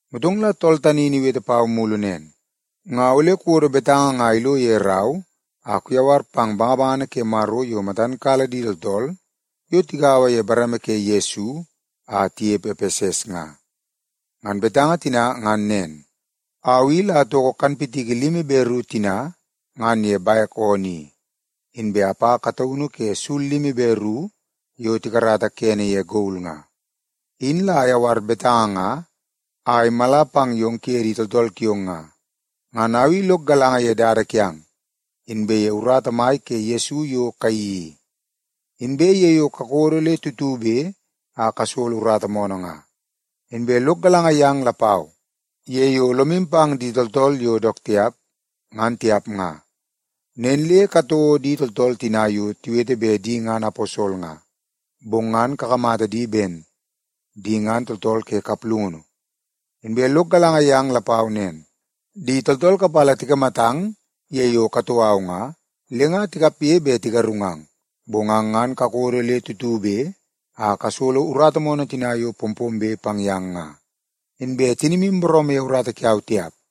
Motong la tool tani in iwete pau mulu nen, “Nga ole kuwodo betanga nga ilo ye rau a kuyawar pang bangabangana ke Maro yo matan kala di tooltool yo tigaua ye bareme ke Yesu a tinepe Epeses nga. Ngan betanga tina ngan nen: Au i la atoko kanpitiki limi be ru tina ngan ye bek oonoo i, inbe apa kataunu ke sul limi be ru yo tikarata kene ye gol nga. Au tani la ayawar betanga nga a imala pang yong kuye di tooltool kiong nga. Ngan au i lok galanga ye dada kiang, inbe ye urata mai ke Yesu yo kayeii i, inbe ye yo kakodo le tutube a kasolo urata moonoo nga. Inbe lok galanga yang lapau ye yo lomu pang di tooltool yo dook tiap, ngan tiap nga. Nen le katouo di tooltool tina yo tiwete bet di ngan aposol nga, bong ngan kakamata di ben di ngan tooltool ke kaplungunu. Inbe lok galanga yang lapau nen, di tooltool kapala tikamatang ye yo katoo au nga, le nga tikapge bet tigarungang. Bong ang ngan kakodo le tutube a kasolo urata moonoo tina yo pompombe pang yang nga, inbe tinimu booroomoo ye urata kiau tiap.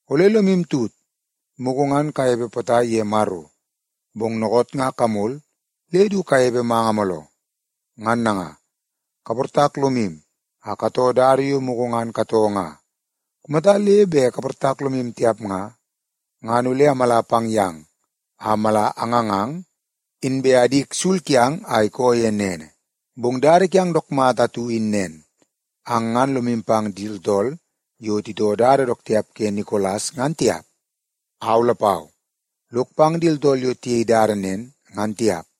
Ole lomu tut, mugu ngan kanepe potai ye Maro, bong dookoot nga kamol le du kanepe manga mooloo. Ngan nanga, kaportak lomu a katoo dada yo mugu ngan katoo nga. Kumata le bet kaportak lomu tiap nga, ngan ole amala pang yang a mala angangang, inbe adik sul kiang a ikoo ye nene. Bong dada kiang dook mata atu in nen. Ang ngan lomu pang di tooltool yo titoo dada dook tiap ke Nikolas ngan tiap. Au lapau lok pang di tooltool yo tiyei dada nen ngan tiap.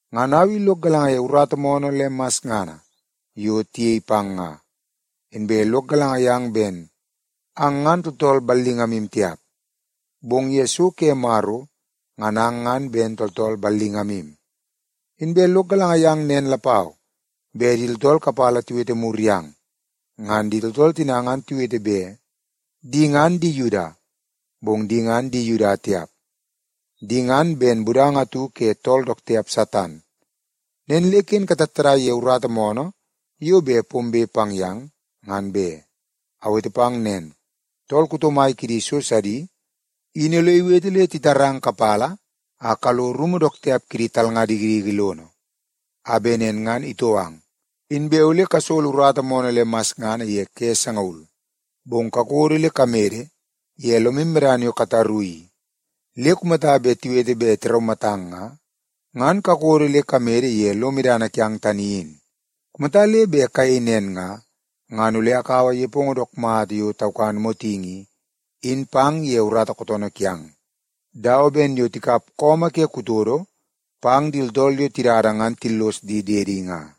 Ngan au i lok galanga ye urata moonoo le masngana yo tiyei pang nga. Inbe lok galanga yang ben ang ngan tooltool ballingamu tiap, bong ye so ke Maro ngan ang ngan ben tooltool ballingamu. Inbe lok galanga yang nen lapau bet di tooltool kapala tiwete mur yang. Ngan di tooltool tina ngan tiwete bet di ngan di Yuda, bong di ngan di Yuda tiap. Di ngan ben budanga atu ke tool dook tiap Satan. Nen le ken katattadai ye urata moonoo yo bet pombe pang yang, ngan be. Awete pang nen, tool kuto mai kidi so sidi in ole iwete le titarang kapala a kalo rumu dook tiap kidi talnga dikidiki lono, a bet nen ngan itou ang. Inbe ole kasolo urata moonoo le masngana ye ke sangaul. Bong kakodo le kamede ye lomu medana yo kataru i le kumata tiwete bet tiraumatang nga, ngan kakodo le kamede ye lo medana kiang tani in. Kumata le bet kayei nen nga, ngan ole akaua nepongo dook mata yo taukan motingi i, in pang ye urata kootoonoo kiang, dawa ben yo tikap su ke kutodo pang di tooltool yo tidada ngan le tillos di diedi nga.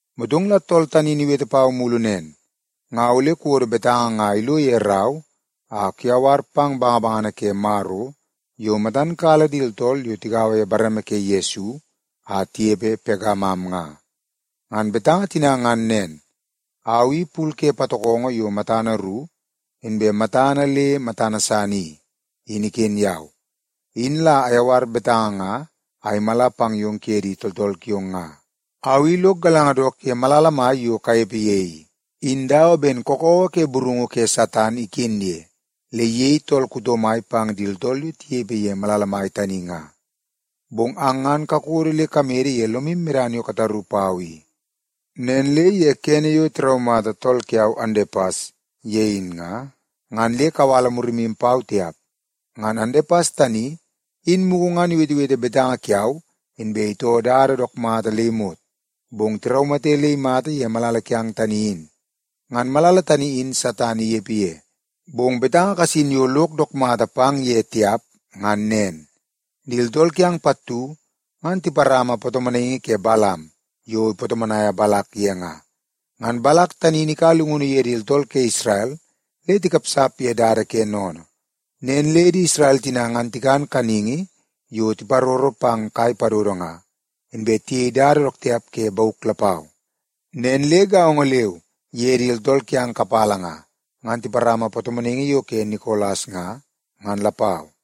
Motong la tool tani in iwete pau mulu nen, “Nga ole kuwodo betanga nga ilo ye rau a kuyawar pang bangabangana ke Maro yo matan kala di tooltool yo tigaua ye bareme ke Yesu a tinepe Pegamam nga. Ngan betanga tina ngan nen: Au i pul ke patokongo yo matana ru inbe matana le matana san i, in iken yau. Au tani la ayawar betanga nga a imala pang yong kuye di tooltool kiong nga. Au i lok galanga dook ye malala mai yo kanepe ye i, in dawa ben kakawa ke burungu ke Satan iken ye le iyei tool kuto mai pang di tooltool yo tinepe ye malala tani nga. Bong ang ngan kakodo le kamede ye lomu medana yo kataru pau i. Nen le ye kene yo tiraumata tool kiau, Andepas, ye in nga, ngan le kawala murimu pau tiap. Ngan Andepas tani in mugu ngan iwetewete betanga kiau inbe itoo dook mata le imot, bong tiraumate le imata ye malala kiang tani in. Ngan malala tani in Satan inepe ye. Bong betanga kasin yo lok dook mata pang ye tiap, ngan nen. Di tooltool kiang pattu ngan tiparama patomonaingi ke Balam yo ipatomonaia Balak ye nga. Ngan Balak tani in ikaua llungunu ye di tooltool ke Isrel le tikapsap a titoo dada yo ke sennene i. Nen le di Isrel tina ngan tikan kaningi yo tiparoro pang kai padodo nga, inbe tiyei dada dook tiap ke bauk lapau. Nen le gaongo leu ye di tooltool kiang kapala nga, ngan tiparama patomonaingi yo ke Nikolas nga, ngan lapau.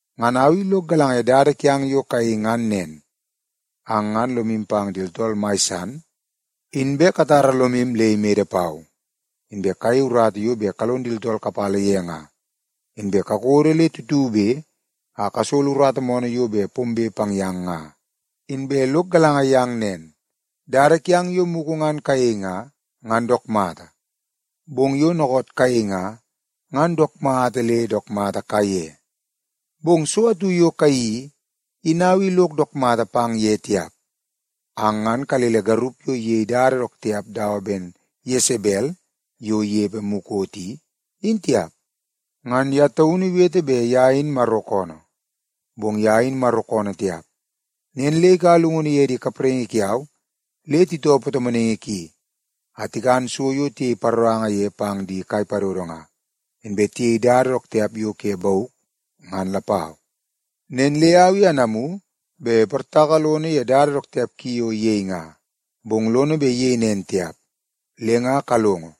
Ngan au i lok galanga ye dada kiang yo kayei ngan nen. Ang ngan lomu pang di tooltool mai san, inbe katara lomu le imede pau, inbe kayei urata yo bet kalon di tooltool kapala ye nga, inbe kakodo le tutube a kasolo urata moonoo yo pombe pang yang nga. Inbe lok galanga yang nen, dada kiang yo mugu ngan kayei nga, ngan dook mata, bong yo dookoot kayei nga, ngan dook mata le dook mata kaiye. Bong so atu yo kayeii i, in au i lok dook mata pang ye tiap. Ang ngan kalele garup yo iyei dada dook tiap dawa ben Yesebel yo inepe mukot i, in tiap. Ngan ye taunu iwete bet ye in Maro koonoo, bong ye in Maro koonoo tiap. Nen le ikaua llungunu ye di kapraingi kiau le titoo patomonaingi ki a tikan so yo tiyei paroranga ye pang di kai padodo nga, inbe tiyei dada dook tiap yo ke bauk, ngan lapau. Nen le au i anamu bet iportaka lono ye dada dook tiap ki yo iyei nga, bong lono bet iyei nen tiap. Le nga kalongo,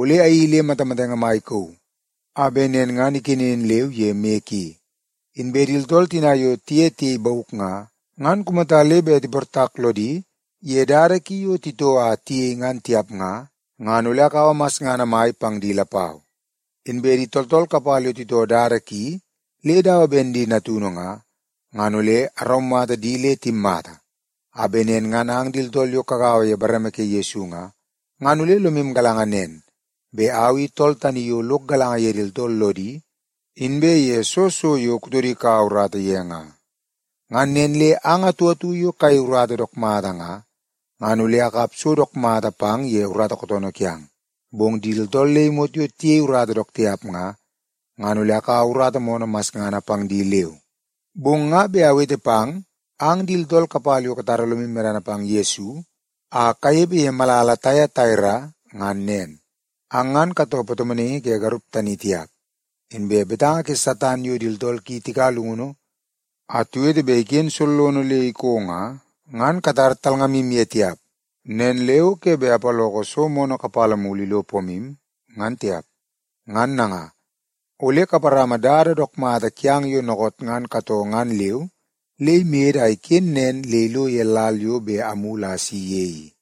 ole ayeii le matamatenge mai ikauu a bet nen ngan ikenen leu ye moi ki. Inbe di tooltool tina yo tiye tiyei bauk nga, ngan kumata le bet tiportak lodi ye dada ki yo titoo a tiyei ngan tiap nga, ngan ole akaua masngana mai pang di lapau. Inbe di tooltool kapala yo titoo dada ki le dawa ben di natunu nga, ngan ole araumata di le timmata, a bet nen ngan ang di tooltool yo kagaua ye bareme ke Yesu nga, ngan ole lomu galanga nen bet au i tool tani yo lok galanga ye di tooltool lodi inbe ye soo so yo kutodi ikaua urata ye nga. Ngan nen le ang atu atu yo kayei urata dook mata nga, ngan ole akap so dook mata pang ye urata kootoonoo kiang. Bong di tooltool le imot yo tiyei urata dook tiap nga, ngan ole akaua urata moonoo masngana pang di leu. Bong nga bet awete pang ang di tooltool kapala yo katara lomu medana pang Yesu a kanepe ye malala Taiataira ngan nen. Ang ngan katoo patomonaingi ke garup tani tiap. Inbe betanga ke Satan yo di tooltool ki tikaua llungunu a tiwete bet iken sollono le iko nga, ngan katar talngamu ye tiap. Nen le o ke bet apaloko so moonoo kapala mulu ilo pomu, ngan tiap. Ngan nanga, ole kaparama dada dook mata kiang yo dookoot ngan katoo ngan leu le imede a iken nen le ilo ye lal yo bet amulu a asi ye i.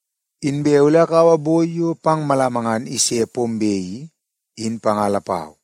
Inbe ole akaua boi yo pang malama ngan ise pombe i, in panga lapau.